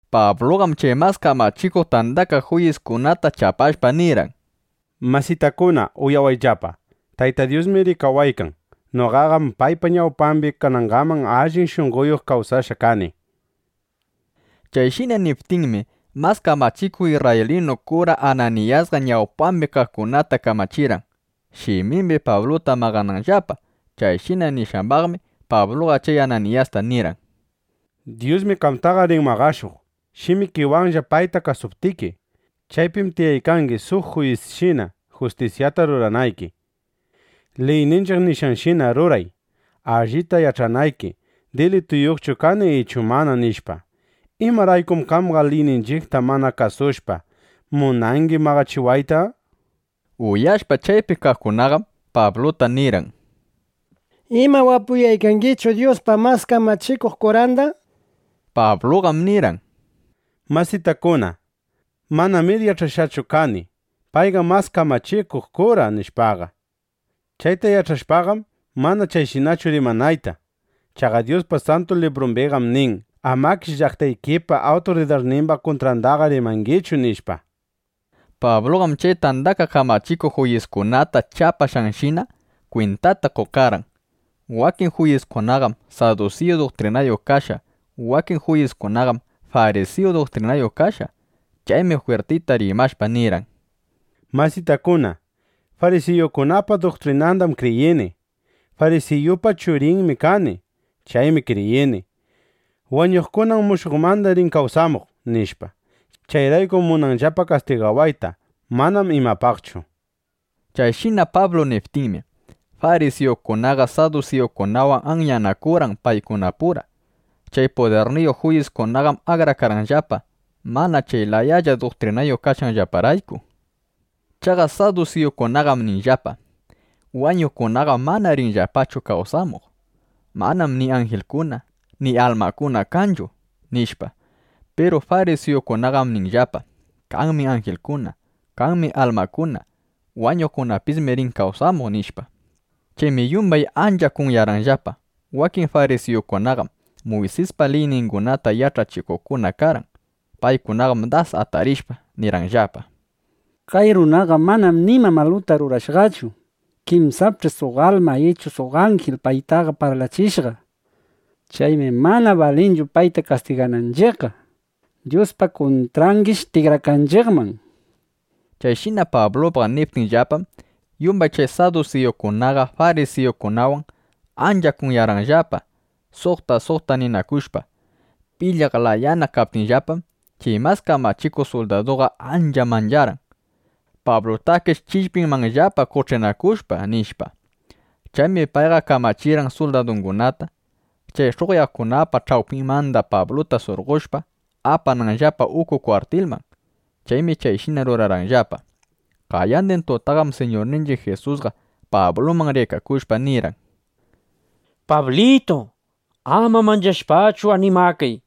Pabluqam chay Mas Kamachikuq Tandakaq Juyiskunata chapashpa nirqan: —Masitakuna, uyawayllapa. Tayta Dyusmi rikawaykan. Noqaqam paypa ñawpambi kanangaman allin shunqoyuq kawsashqa kani. Chayshina niptinmi, mas kamachikuq isrraylinu kura Ananiyasqa ñawpambi kaqkunata kamachirqan, shimimbi Pabluta maqananllapa. Chayshina nishqambaqmi, Pabluqa chay Ananiyasta nirqan: —¡Dyusmi qamtaqa rin maqashuq, shimikiwanlla payta kasuptiki! Chaypim tiyaykangi suq juyisshina, justisyata ruranayki. Liyninchiq nishqanshina ruray, allita yach'anayki, dilituyuqchu kani ichu mana, nishpa. ¿Imaraykum qamqa liyninchiqta mana kasushpa, munangi maqachiwaytaqa? Uyashpa, chaypi kaqkunaqam Pabluta nirqan: —¿Ima wapuyaykangichu Dyuspa mas kamachikuq kuranda? nishpa. Pabluqam nirqan: —Masitakuna, manamir yach'ashqachu kani: Payqam mas kamachikuq kura, nishpaqa. Chayta yach'ashpaqam, mana chayshinachu rimanayta. Chaqa Dyuspa Santu Librumbiqam nin: “Amakish llaqtaykipa awturidarnimba kuntrandaqa rimangichu”, nishpa. Pabluqam chay tandakaq kamachikuq juyiskunata chapashqanshina, kwintata qokarqan: Wakin juyiskunaqam sadusiyu duktrinayuq kashqa, wakin juyiskunaqam farisiyu duktrinayuq kashqa. Chaymi jwirtita rimashpa, nirqan: —Masitakuna, farisiyukunapa duktrinandam kriyini. Farisiyupa churinmi kani. Chaymi kriyini: Wañuqkunam mushuqmanda rin kawsamuq, nishpa. Chayraykum munanllapa kastigawayta. Manam imapaqchu, nishpa. Chayshina Pablu niptinmi, farisiyukunaqa sadusiyukunawan anyanakurqan paykunapura. Chay pudirniyuq juyiskunaqam akrakarqanllapa, mana chay layalla duktrinayuq kashqanllaparayku. Chaqa sadusiyukunaqam ninllapa: Wañuqkunaqam mana rinchu kawsamuq. Manam ni anjilkuna, ni almakuna kanchu, nishpa. Piru farisiyukunaqam ninllapa: Kanmi anjilkuna, kanmi almakuna. Wañuqkunapismi rin kawsamuq, nishpa. Chaymi yumbay ancha kunyarqanllapa. Wakin farisiyukunaqam Muysispa liyningunata yach'achikuqkuna karqan. Paykunaqam das atarishpa, nirqanllapa: —Kay runaqam mana nima maluta rurashqachu. Kinsapch'i suq alma ichu suq anjil paytaqa parlachishqa. Chaymi mana balinchu payta kastigananchiqqa. Dyuspa kuntrangish tikrakanchiqman. Chayshina Pablupaq niptinllapam, yumbay chay sadusiyukunaqa farisiyukunawan ancha kunyarqanllapa, suqta suqta ninakushpa. Pilyaq layana kaptinllapam, chay mas kamachikuq suldaduqa ancha mancharqan: Pablutakish chillpinmanllapa qoch'inakushpa, nishpa. Chaymi payqa kamachirqan suldadungunata, chay sh'uqyaqkunapa ch'awpinmanda Pabluta surqoshpa, apananllapa uku kwartilman. Chaymi chayshina rurarqanllapa. Qayandin tutaqam Siñurninchiq Jisusqa Pabluman rikakushpa, nirqan: —Pablitu, ama manchashpachu, animakay.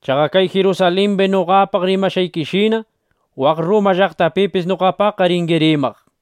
Chaqa kay Jirusalimbi noqapaq rimashqaykishina, waq Rruma llaqtapipis noqapaqqa ringi rimaq, nishpa.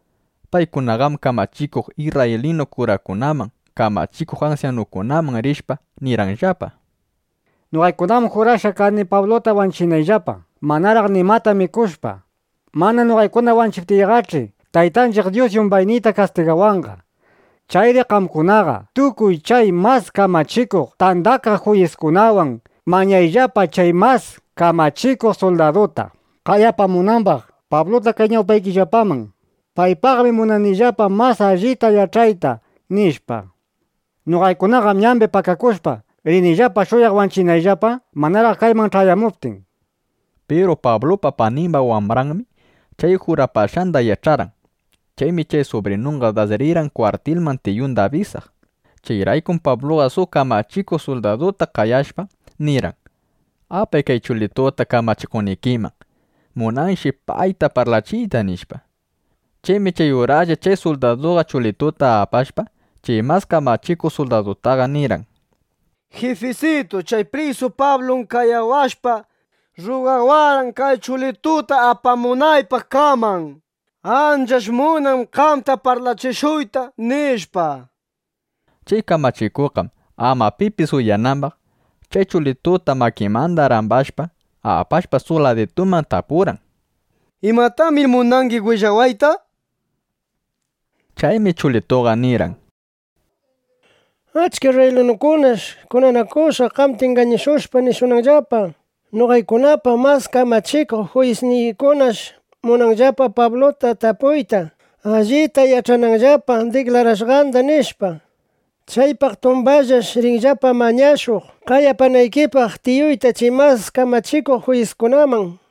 Paykunaqam kamachikuq isrraylinu kurakunaman, kamachikuq ansyanukunaman rishpa, nirqanllapa: —Noqaykunaqam jurashqa kani Pabluta wanchinayllapa, manaraq nimata mikushpa. Mana noqaykuna wanchiptiyqach'i, Taytanchiq Dyus yumbayniyta kastigawanqa. Chayri qamkunaqa tukuy chay Mas Kamachikuq Tandakaq Juyiskunawan mañayllapa chay mas kamachikuq suldaduta, qaya apamunambaq Pabluta kay ñawpaykillapaman: “Paypaqmi munanillapa mas allita yach'ayta”, nishpa. Noqaykunaqam ñambi pakakushpa, rinillapa shuyaq wanchinayllapa, manaraq kayman ch'ayamuptin, nishpa. Piru Pablupa panimba wambranmi chay jurapashqanda yach'arqan. Chaymi chay subrinunqa das rirqan kwartilman tiyunda abisaq. Chayraykum Pabluqa suq kamachikuq suldaduta qayashpa, nirqan: —Apay kay chulituta kamachikuqnikiman. Munanshi payta parlachiyta, nishpa. Chaymi chay uraslla chay suldaduqa chulituta apashpa, chay mas kamachikuq suldadutaqa nirqan: —Jifisitu, chay prisu Pablum qayawashpa, rrugawarqan, kay chulituta apamunaypaq qaman. Anchash munan qamta parlachishuyta, nishpa. Chay kamachikuqqam ama pipis uyanambaq, chay chulituta makinmanda rambashpa, apashpa suq ladituman, tapurqan: —¿Imatamir munangi willawayta? nishpa. Chaymi chulituqa nirqan: —Achka isrraylinukunash kunanakushqa, qamta ingañashushpa, nishunanllapa: “Noqaykunapa mas kamachikuq juyisniykunash munanllapa Pabluta tapuyta, allita yach'ananllapa diklarashqanda”, nishpa. Chaypaq tumbanllash rinllapa mañashuq, qaya apanaykipaq tiyuyta chay Mas Kamachikuq Juyiskunaman.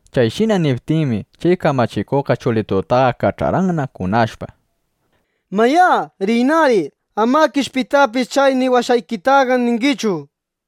Chayshina niptinmi, chay kamachikuqqa chulitutaqa kach'arqanna kunashpa: —Mayá, riynari. Amakish pitapis chay niwashqaykitaqa ningichu, nishpa.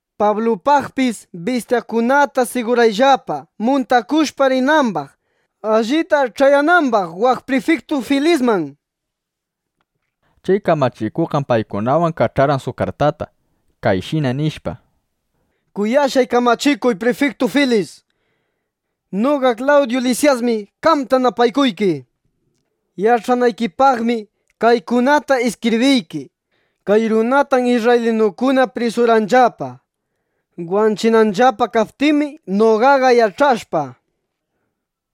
Pablupaqpis bistyakunata sigurayllapa, muntakushpa rinambaq, allita ch'ayanambaq waq prifiktu Filisman, nishpa. Chay kamachikuqqam paykunawan kach'arqan suq kartata, kayshina nishpa: “Kuyashqay kamachikuq prifiktu Filis, noqa Klawdyu Lisyasmi qamta napaykuyki. Yach'anaykipaqmi kaykunata iskibriyki: Kay runatam isrraylinukuna prisurqanllapa. Wanchinanllapa kaptinmi, noqaqa yach'ashpa: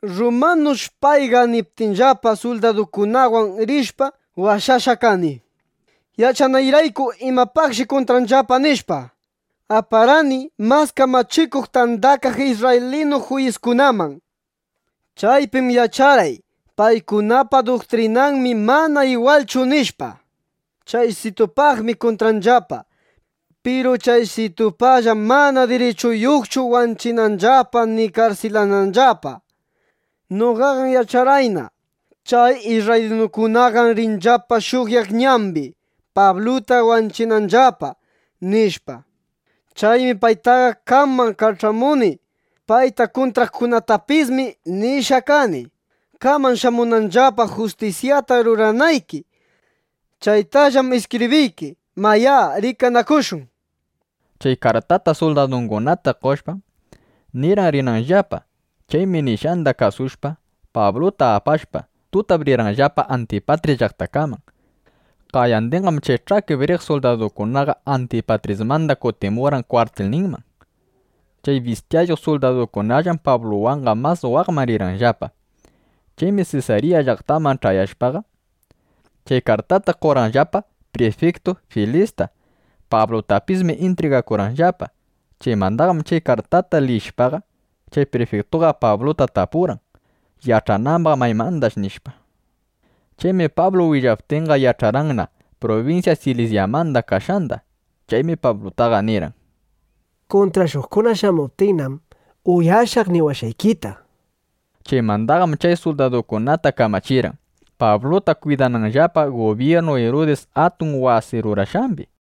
Rrumanush payqa niptinllapa, suldaduykunawan rishpa, washashqa kani. Yach'anayrayku imapaqshi kuntranllapa, nishpa, aparqani Mas Kamachikuq Tandakaq Isrraylinu Juyiskunaman. Chaypim yach'arqay: Paykunapa duktrinanmi mana igwalchu, nishpa. Chaysitupaqmi kuntranllapa. Piru chaysitupaqllam mana dirichuyuqchu wanchinanllapa ni karsilananllapa. Noqaqam yach'arqayna: Chay isrraylinukunaqam rinllapa shuyaq ñambi, Pabluta wanchinanllapa, nishpa. Chaymi paytaqa qaman kach'amuni. Payta kuntraqkunatapismi nishqa kani, qaman shamunanllapa, justisyata ruranayki. Chaytallam iskibriyki. Mayá, rikanakushun”, nishpa. Chay kartata suldadungunata qoshpam, nirqan rinanllapa. Chaymi nishqanda kasushpa, Pabluta apashpa, tutap rirqanllapa Antipatris llaqtakaman. Qayandinqam chay ch'akip riq suldadukunaqa Antipatrismanda kutimurqan kwartilninman. Chay bistyayuq suldadukunallam Pabluwanqa mas waqman rirqanllapa. Chaymi Sesarya llaqtaman ch'ayashpaqa, chay kartata qorqanllapa prifiktu Filista. Pablutapismi intrigakurqanllapa. Chaymandaqam chay kartata liyishpaqa, chay prifiktuqa Pabluta tapurqan, yach'anambaq: Maymandash, nishpa. Chaymi Pablu willaptinqa, yach'arqanna prubinsya Silisyamanda kashqanda. Chaymi Pablutaqa nirqan: —Kuntrashuqkuna shamuptinnam, uyashaq niwashqaykita, nishpa. Chaymandaqam chay suldadukunata kamachirqan, Pabluta kwidananllapa gubyirnu Irudis atun wasi rurashqambi.